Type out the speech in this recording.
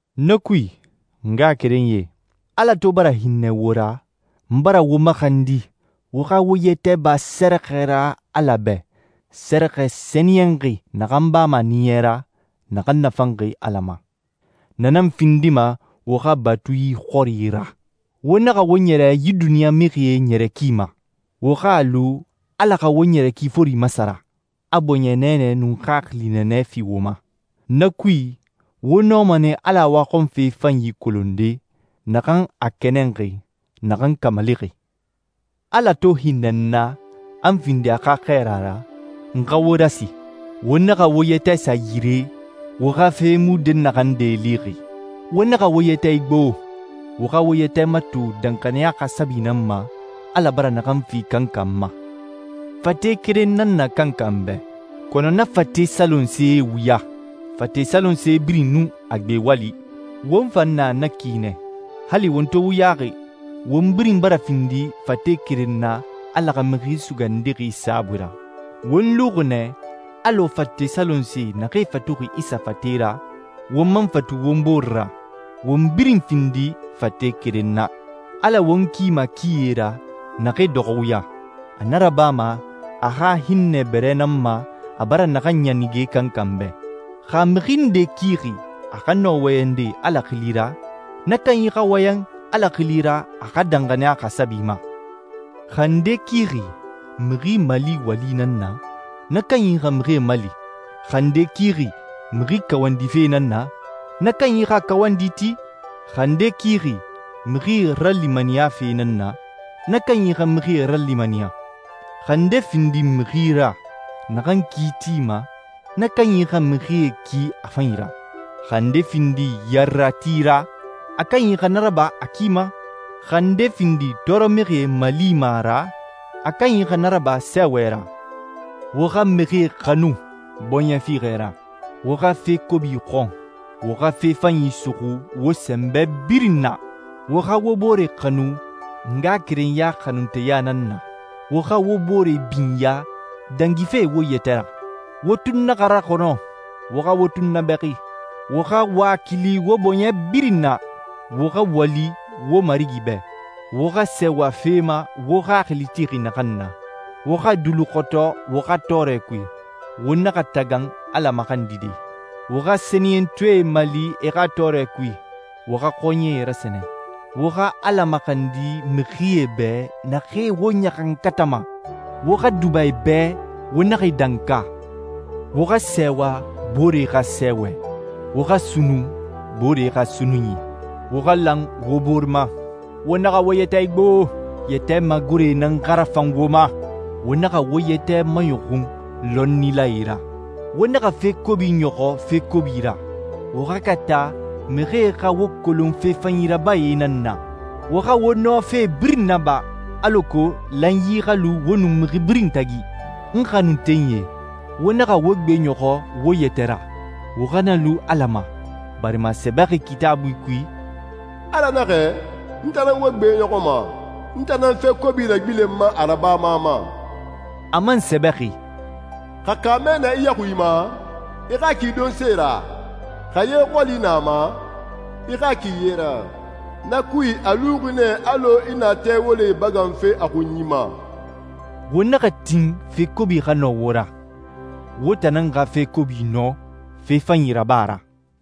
Na kui, n ngaxakerenyie, Ala to bara hinnɛ wo ra, n bara wo maxandi wo xa wo yɛtɛ ba sɛrɛxɛ ra Ala bɛ, sɛrɛxɛ sɛniyɛnxi naxan bama a ɲiɲɛ ra, naxan nafanxi Ala ma. Na nan findima wo xa batui xɔri ra. Wo naxa wo ɲɛrɛ yi duniɲa mixie ɲɛrɛ ki ma. Wo xa a lu Ala xa wo ɲɛrɛ ki fori masara, a bɔɲɛ nɛɛnɛ nun xaxili nɛɛnɛ fi wo ma. Na kui, wo nɔma nɛ Ala waxɔnfe fanyi kolonde, naxan a kɛnɛnxi, naxan kamalixi. Ala to hinnɛ n na, a n findi a xa xɛɛra ra, n xa wo rasi: Wo naxa wo yɛtɛ sa yire, wo xa fe mu dɛnnaxande lixi. Wo naxa wo yɛtɛ igbo, wo xa wo yɛtɛ mato danxaniya xasabi nan ma, Ala bara naxan fi kankan ma. Fate keren nan na kankan bɛ, kɔnɔ na fate salonsee wuya. Fate salonse birin nun a gbe wali. Won fan na na ki nɛ. Hali won to wuyaxi, won birin bara findi fate keren na Ala xa Mixi Sugandixi saabui ra. Won luxi nɛ alɔ fate salonsee naxee fatuxi Isa fate ra won man fatu won bore ra, won birin findi fate keren na. Ala won kima kie ra naxee dɔxɔ wuya. A na rabama a xa hinnɛ bɛrɛ nan ma a bara naxan ɲanige kankan bɛ. Xa a mixi nde kixi a xa nɔ wɔyɛnde Ala xili ra, na kanyi xa wɔyɛn Ala xili ra a xa danxaniya xasabi ma. Xa a nde kixi mixi mali wali nan na, na kanyi xa mixie mali. Xa a nde kixi mixi kawandife nan na, na kanyi xa kawandi ti. Xa a nde kixi mixi ralimaniyafe nan na, na kanyi xa mixie ralimaniya. Xa a nde findi mixi ra naxan ki tima, na kanyi xa mixie ki a fanyi ra. Xa a nde findi yarerati ra, a kanyi xa na raba a ki ma. Xa a nde findi tɔɔrɔmixie malima ra, a kanyi xa na raba sɛɛwɛ ra. Wo xa mixie xanu bɔɲɛ fiixɛ ra. Wo xa fe kobi xɔn, wo xa fe fanyi suxu wo sɛnbɛ birin na. Wo xa wo bore xanu ngaxakerenya xanunteya nan na. Wo xa wo bore binya dangife wo yɛtɛ ra. Wo tun naxa raxɔnɔ, wo xa wo tunnabɛxi. Wo xa wakili wo bɔɲɛ birin na. Wo xa wali wo Marigi bɛ. Wo xa sɛɛwa fe ma wo xaxili tixi naxan na. Wo xa duluxɔtɔ wo xa tɔɔrɛ kui. Wo naxa tagan Ala maxandide. Wo xa sɛniyɛntɔɛe mali e xa tɔɔrɛ kui. Wo xa xɔɲɛe rasɛnɛ. Wo xa Ala maxandi mixie bɛ naxee wo ɲaxankatama. Wo xa duba e bɛ, wo naxa e danka. Wo xa sɛɛwa booree xa sɛɛwɛ, wo xa sunnun boore xa sunnunyi. Wo xa lan wo bore ma. Wo naxa wo yɛtɛ igbo, yɛtɛ magore nan xa rafan wo ma. Wo naxa wo yɛtɛ maɲɔxun lɔnnilae ra. Wo naxa fe kobi ɲɔxɔ fe kobi ra. Wo xa kata mixie xa wo kolon fe fanyi rabae nan na. Wo xa wo nɔ fe birin naba alako lanyi xa lu wo nun mixi birin tagi. N xanuntenyie, wo naxa wo gbeɲɔxɔ wo yɛtɛ ra, wo xa na lu Ala ma, barima a sɛbɛxi Kitaabui kui, «Ala naxɛ, n tan nan wo gbeɲɔxɔma, n tan nan fe kobi ragbilenma a rabama ma.» A man sɛbɛxi, «Xa kaamɛ na i yaxui ma, i xa a ki donse ra. Xa ye xɔli na a ma, i xa a ki ye ra. Na kui a luxi nɛ alɔ i na tɛ wolee ibaganfe a xunyi ma.» Wo naxa tin fe kobi xa nɔ wo ra, wo tan nan xa fe kobi nɔ, fe fanyi raba ra.